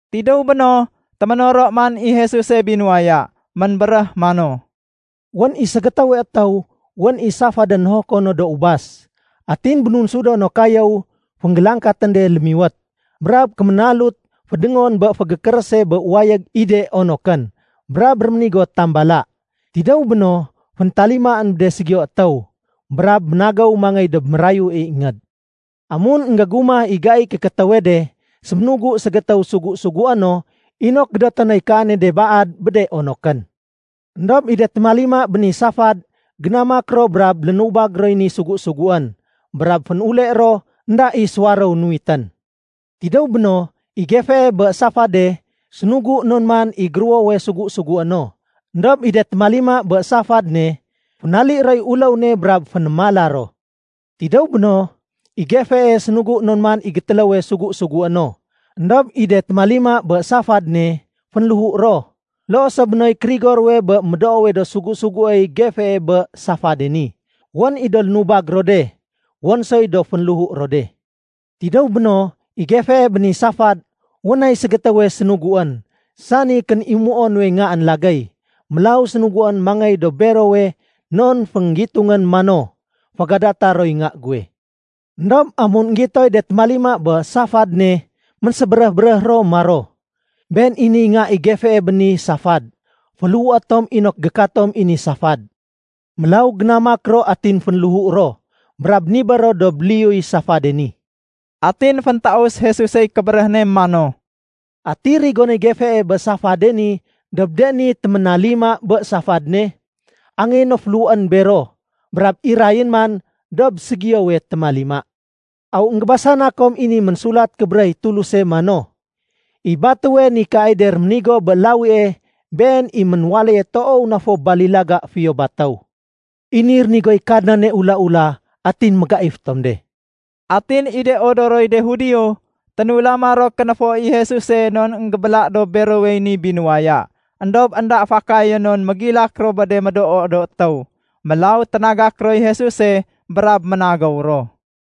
Tidéw béno, téménoro man i Jesuse binuwaya. Ménbéréh mano, “Wén i ségétéwe étéw wén i safadén nohoko no do ubas. Atin bénunsudo no kayéw fénggélangkatén de lémiwét, brab kéménalut fédéngon bé fégékérése bé wayég i de onokén. Brab réménigo tambala. Tidéw béno, féntalimaén bé de ségiyo étéw, brab ménagéw mangéy dob mérayue ingéd. Amun énggégumah i gaiy kékétéwe de, séménugu ségétéw sugu-sugué no inok gédoté noy kaane de baad bé de onokén. Endob i de témalima bé ni safad génamak ro brab lénubag roy ni sugu-suguén. Brab fénule ro énda i suwaréw nuwitén. Tidéw béno, i gefee bé safade sénugu non man i géruwowe sugu-sugué no. Endob i de témalima bé safad ne, fénali roy uléw ne brab fénémala ro. Tidéw béno, i gefee sénugu non man i gétéléwe sugu-sugué no. Endob i de témalima bé safad ne, fénléhu ro. Loo so bé noy kérigo ruwe bé de médoo do sugu-suguéy gefee bé safade ni. Wén i do lénubag ro de, wén soy dob fénléhu ro de. Tidéw béno, i gefee bé ni safad, wén nay ségétéwe sénuguén, sani kénimuo nuwe ngaén lagéy. Mélaw sénuguén mangéy dob berowe non fénggitungén mano, ‘Fégadata roy nga guwe.’ Endob amun énggitoy de témalima bé safad ne, ménsébéréh-béréh ro maro, ‘Been i niy nga i gefee bé ni safad. Féléhu tom inok gékatom i ni safad.’ Mélaw génamak ro atin fénléhu ro, brab nibér ro dob liyuy safade ni.” Atin féntaus Jesusey kébéréh ne mano, “Ati rigonéy gefee bé safade ni dob de ni téménalima bé safad ne? Angéyé no féléhuén bero. Brab irayén man dob ségiyowe témalima. Aw énggébasana kom i ni Ménsulat Kébéréh i Tuluse mano, ‘I batéwe nikaay de réménigo bé lawie, been i ménwaléye toow na fo balilaga fiyo batéw. I ni rénigoy Kadnane ula-ula, atin mégaif tom de.’” Atin i de odoroy de Judio, ténulama ro kénéfo i Jesuse non énggébéla dob berowey ni binuwaya. Endob énda fakayén non mégilak ro bé de médoo do étéw. Mélaw ténagak roy Jesuse brab ménagéw ro.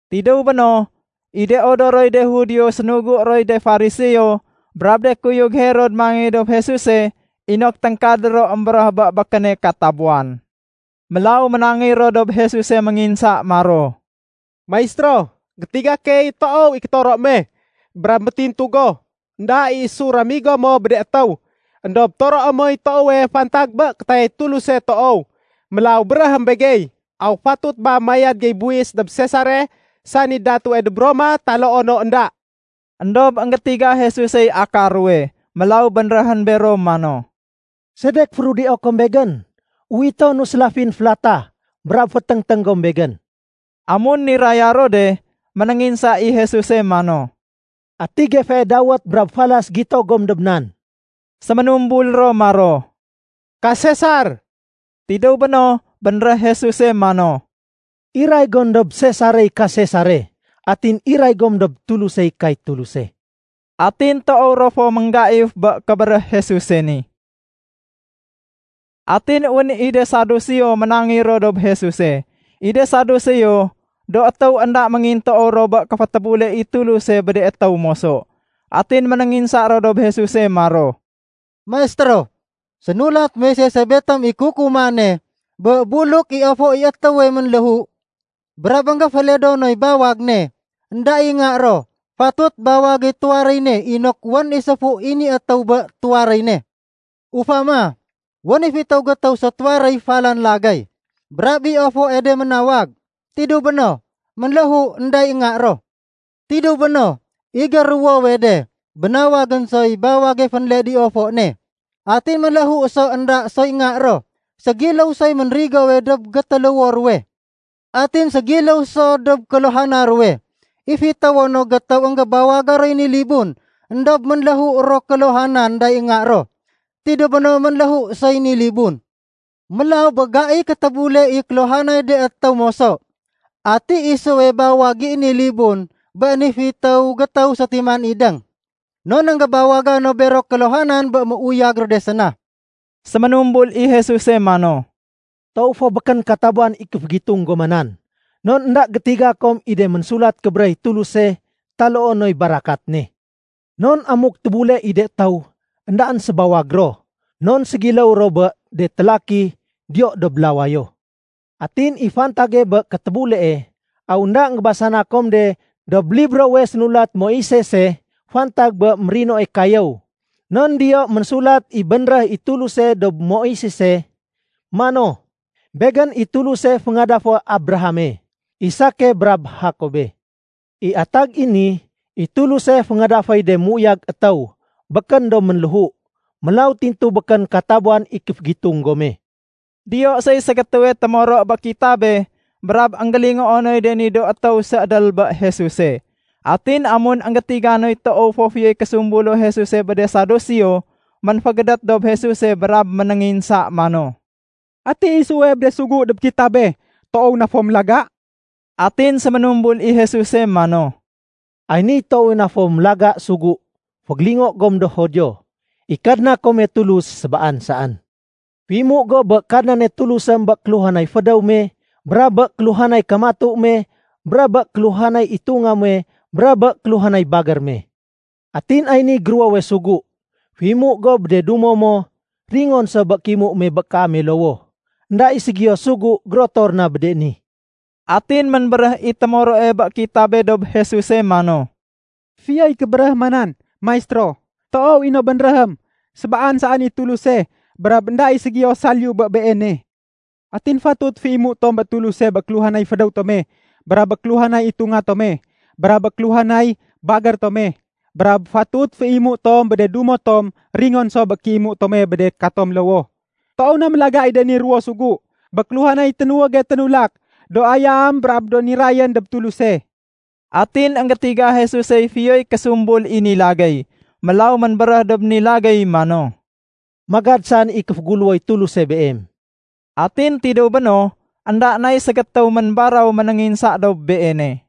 Tidéw béno, i de odoroy de Judio sénugu roy de Fariseo brab de kuyug Herod mangéy dob Jesuse inok téngkadé ro émbéréh bé békéne katabuwan. Mélaw ménangéy ro dob Jesuse ménginsa maro, “Maistéro, gétiga key toow i kétoro me. Brab métintu go, énda i isu ramigo mo bé de étéw. Endob toroé moy toowe fantag bé kétayay Tuluse toow. Mélaw béréhém begey, aw fatut ba mayad gey buwis dob Sesare sani datue dob Roma taloo no énda?” Endob énggétiga Jesusey akar ruwe, mélaw bénréhén bero mano, “Sedek férudio kom Begén? Uwitonu sélafin félatah, brab féténgténg gom Begén.” Amun niraya ro de, ménénginsa i Jesuse mano, “Ati gefee dawét brab falas gito gom dob nan?” Séménumbul ro maro, “Ka Sesar.” Tidéw béno, bénréh Jesuse mano, “Iray gom dob Sesarey ka Sesare. Atin iray gom dob Tulusey kay Tuluse.” Atin toow ro fo ménggaif bé kébéréh Jesuse ni. Atin wén i de Saduseo ménangéy ro dob Jesuse. I de Saduseo do étéw énda méngintoow ro bé kéfétébule i Tuluse bé de étéw moso. Atin ménénginsa ro dob Jesuse maro, “Maistéro, sénulat Moisese betom i kukumane bé buluk i ofo i étéwe ménléhu, brab énggéféledo noy bawag ne, énda i nga ro, fatut bawagéy tuwaréy ne inok wén i séfu i ni étéw bé tuwaréy ne. Ufama, wén i fitéw gétéw sétuwaréy falan lagéy. Brab i ofoe de ménawag. Tidéw béno, ménléhu énda i nga ro. Tidéw béno, i géruwowe de bénawagén soy bawage fénled i ofo ne. Atin ménléhu so énda soy nga ro. Ségiléw soy ménrigowe dob gétéléwo ruwe. Atin ségiléw so dob kéluhana ruwe. I fitéwo no gétéw énggébawaga roy ni libun éndob ménléhu ro kéluhanan énda i nga ro. Tidéw béno, ménléhu soy ni libun. Mélaw bé gaiy kétébule i kéluhanay de étéw moso, ati isuwe bawag i ni libun bé ni fitéw gétéw sétiman idéng? Non énggébawaga no bero kéluhanan bé méuyag ro de séna?” Séménumbul i Jesuse mano, “Toow fo békén katabuwan i kéfégitung goma nan, non énda gétiga kom i de Ménsulat Kébéréh i Tuluse taloo noy barakat ne. Non amuk tébule i de étéw, éndaén sébawag ro. Non ségiléw ro bé de télaki diyo dob lawayo. Atin i fantage bé kétébulee, aw énda énggébasana kom de dob librowe sénulat Moisese fantag bé mérinoe kayéw? Non diyo ménsulat i bénréh i Tuluse dob Moisese mano, ‘Begén i Tuluse féngadafé Abrahame, Isake, brab Jakobe.’ I atag i ni, i Tuluse féngadaféy de méuyag étéw, békén do ménléhu. Mélaw tintu békén katabuwan i kéfégitung gome.” Diyo soy ségétéwe témoro bé kitabe brab énggélingoo noy de ni do étéw séédél bé Jesuse. Atin amun énggétiga noy toow fo fiyoy késumbulo Jesuse bé de Saduseo, ménfégédét dob Jesuse brab ménénginsa mano, “Ati isuwe bé de sugu dob kitabe toow na fo mélaga?” Atin séménumbul i Jesuse mano, “Ay niy toowe na fo mélaga sugu: ‘Fégélingo gom do Judio, i Kadna kome Tulus sébaan saén. Féimu go bé Kadnane Tulusém bé kéluhanay fédéw me, brab bé kéluhanay kamatu me, brab bé kéluhanay itunga muwe, brab bé kéluhanay bagér me.’ Atin ay niy géruwowe sugu: ‘Féimu go bé de dumo mo ringon so bé kéimu me bé kaame lowoh.’ Enda i ségiyo sugu gérotor na bé de ni.” Atin ménbéréh i témoroe bé kitabe dob Jesuse mano, “Fiyoy kébéréh ma nan, Maistéro. Toow i no bénréhém sébaan saén i Tuluse brab énda i ségiyo saliyu bé Beene. Atin fatut féimu tom bé Tuluse bé kéluhanay fédéw tome, brab bé kéluhanay itunga tome, brab bé kéluhanay bagér tome, brab fatut féimu tom bé de dumo tom ringon so bé kéimu tome bé de katome lowoh. Toow na mélaga i de ni ruwo sugu bé kéluhanay ténuwége ténulak do ayam brab do nirayén dob Tuluse.” Atin énggétiga Jesusey fiyoy késumbul i ni lagéy. Mélaw ménbéréh dob ni lagéy mano, “Magad saén i kéféguléwoy Tuluse beem.” Atin tidéw béno, énda nay ségétéw ménbaraw ménénginsa dob Beene.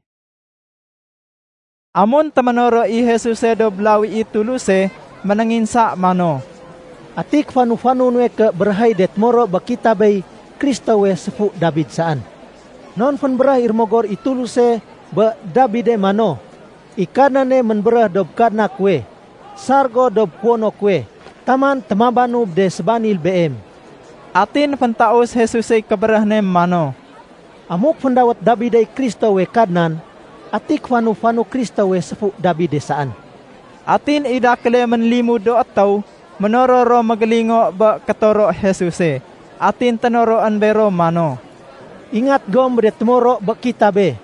Amun téménoro i Jesuse dob lawi i Tuluse, ménénginsa mano, “Ati kéfanu-fanu nuwe ké béréh i de témoro bé kitabey Kristowe séfu Dabid saén? Non fénbéréh i Rémogor i Tuluse bé Dabide mano, ‘I Kadnane ménbéréh dob Kadna kuwe, sar go dob kuwono kuwe, taman témabanu bé de sébanil Beem.’” Atin féntaus Jesusey kébéréh ne mano, “Amuk féndawét Dabidey Kristowe ‘Kadnan’, ati kéfanu-fanu Kristowe séfu Dabide saén?” Atin i dakéle ménlimud do étéw ménoror ro mégélingo bé kétoro Jesuse. Atin ténoroén bero mano, “Ingat gom bé de témoro bé kitabe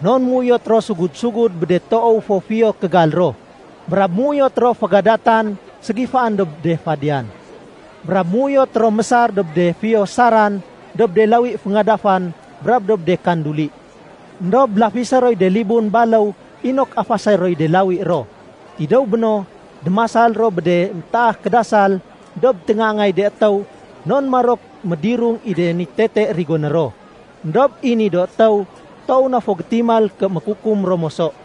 non méuyot ro sugud-sugud bé de toow fo fiyo kégal ro, brab méuyot ro fégadatan ségifaén dob de fadiyan. Brab méuyot ro mésar dob de fiyo saran dob de lawi féngadafan brab dob de kanduli. Endob lafisé roy de libun baléw inok afasé roy de lawi ro. Tidéw béno, démasal ro bé de métaah kédasal dob téngaangay de étéw non marok médirung i de ni tete rigoné ro. Endob i ni do étéw toow na fo gétimal ké mékukum ro moso.”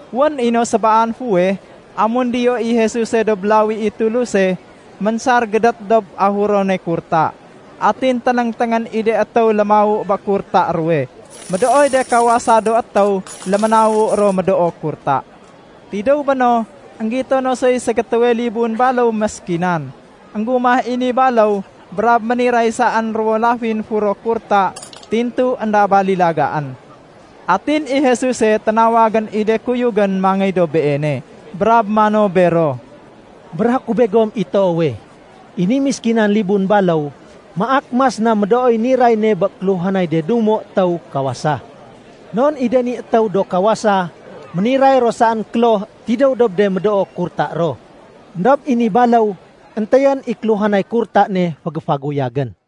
Wén i no sébaan fuweh, amun diyo i Jesuse dob lawi i Tuluse, ménsar gédét dob ahurone kurta. Atin ténéngténgén i de étéw lémawu bé kurta ruwe. Médooy de kawasa do étéw léménawu ro médoo kurta. Tidéw béno, énggito no soy ségétéwe libun baléw méskinan. Enggumah i ni baléw brab méniray saén ruwo lafin furo kurta tintu énda balilagaén. Atin i Jesuse ténawagén i de kuyugén mangéy dob Beene, brab mano bero, “Béréhé ku begom i toowe, i ni méskinan libun baléw maak mas na médooy niray ne bé kéluhanay de dumo étéw kawasa. Non i de ni étéw do kawasa, méniray ro saén kloh tidéw dob de médoo kurta ro. Endob i ni baléw éntéyén i kéluhanay kurta ne fégéfaguyagén.”